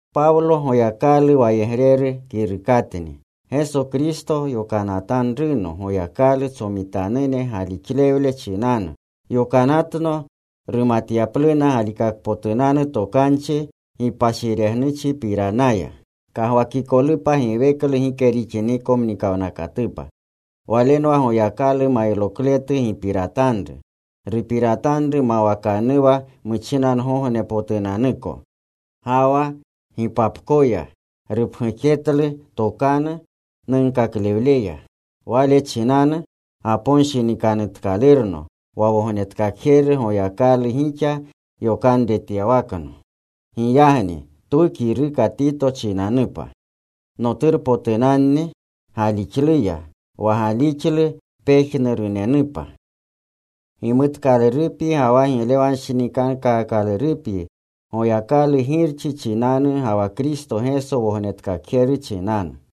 Pawlo Goyakalu wayegreru kirukatni. Geso Kristo yokanatanruno Goyakalu tsomitanune galixlewle chinanu. Yokanatno rumatyapluna galikakpotunanu tokanchi gipashiregnuchipiranaya, kagwakikolupa giweklu gike rixiniko mnikawnakatupa. Walenwa Goyakalu mayrokletu gipiratanru. Rupiratanru mawakanuwa muchinangognepotunanuko. Ga wa gipapkoya rupgujetlu tokanu nunkaklewleya. Wale chinanu gaponshinikanutkalurno, wa Wognetkakjeru Goyakalu gixa yokanretyawakno. Giyagni twu kiruka Tito chinanupa, noturpotunanni galixluya, wa galixlu pejnurunenupa. Gimutkalurupyi ga wa giglewanshinikankaakalurupyi Goyakalu Girchi chinanu ga wa Kristo Geso Wognetkakjeru chinanu.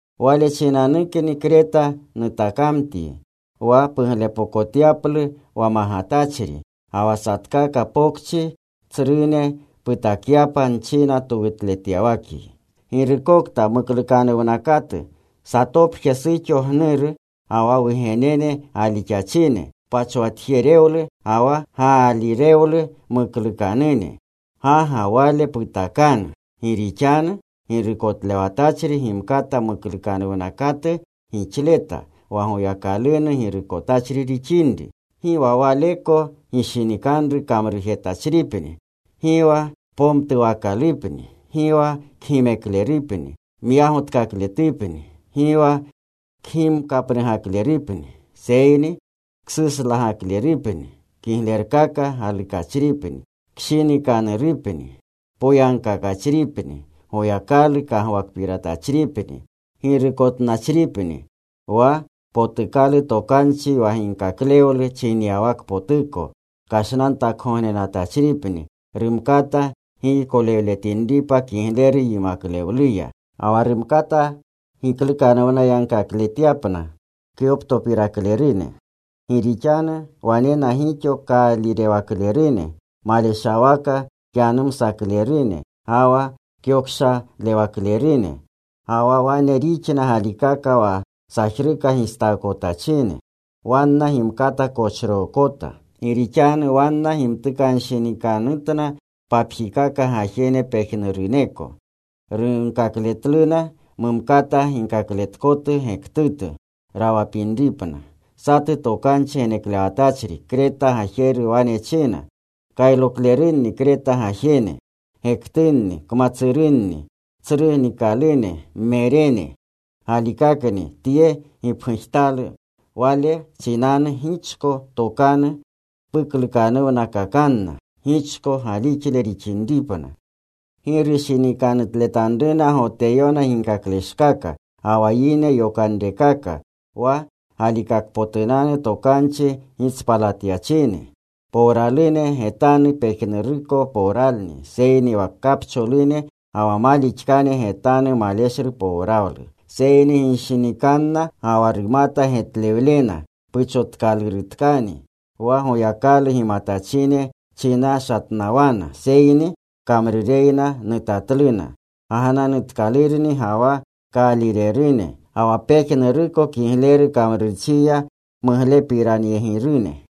Wale chinanukni Kreta nutakamtyi wa puglepokotyaplu wa magatachri. Ga wa satkaka pokchi tsrune putakyapa nchina towutletyawakyi. Girukokta muklukanuwnakatu, satopje suxo gnuru, ga wa wugenene galixachine, pachwatjerewlu ga wa gaalirewlu mukluukanune. Ga ga wale putakanu. Gi rixanu girukotlewatachri gimkata muklukanuwnakatu gixleta, wa Goyakalunu girukotachri rixinri. Gi wa waleko gishinikanru kamrujetachripni. Gi wa pomtuwakalupni. Gi wa kgimeklerupni. Myagotkakakletupni. Gi wa kgimkapnugaklerupni. Seyni ksuslagaklerupni. Kiglerkaka galukachripni. Kshinikanurupni. Poyagkakachripni. Goyakalu kagwakpiratachripni. Girukotnachripni Wa potukalu tokanchi wa ginkaklewlu chinyawakpotuko kashgognenatachripni. Rumkata giykolewletinripa kigleru yimaklewluya. Ga wa rumkata giklukanuwnakakletyapna kyoptopiraklerune. Gi rixanu wanena gixo kaalirewaklerune maleshawaka kyanumsaklerune ga wa kyokshalewaklerune. Ga wa wane rixna galikaka wa sajruka gistaakotachine. Wanna gimkata kochrookota. Gi rixanu wanna gimtukanshinikanutna papjikaka gajene pejnuruneko. Runkakletluna mumkata ginkakletkotu gektutu rawapinripna. Satu tokanchi geneklewatachri Kreta gajeru wane china, “Kayroklerunni Kreta gajene, gektunni kmatsurunni, tsru nikalune, mmerene.” Galikakni tye gipgujtalu. Wale chinanu gichko tokanu puklukanuwnakakanna, gichko galixle rixinripna. Gi rushinikanutletanruna Goteyone ginkakleshkaka, ga wa yine yokanrekaka wa galikakpotunanu tokanchi gitspalatyachine. Powralune getanu pejnuruko powralni. Seyni wa kapcholune ga wa malixkane getanu maleshlu powralu. Seyni ginshinikanna ga wa rumata getlewlena puchotkalurutkani. Wa Goyakalu gimatachine chinashatnawana. Seyni kamrureyna nutatluna. Gagnanutkalunni ga wa kaalirerune. Ga wa pejnuruko kigleru kamrurchiya muglepiranyegirune.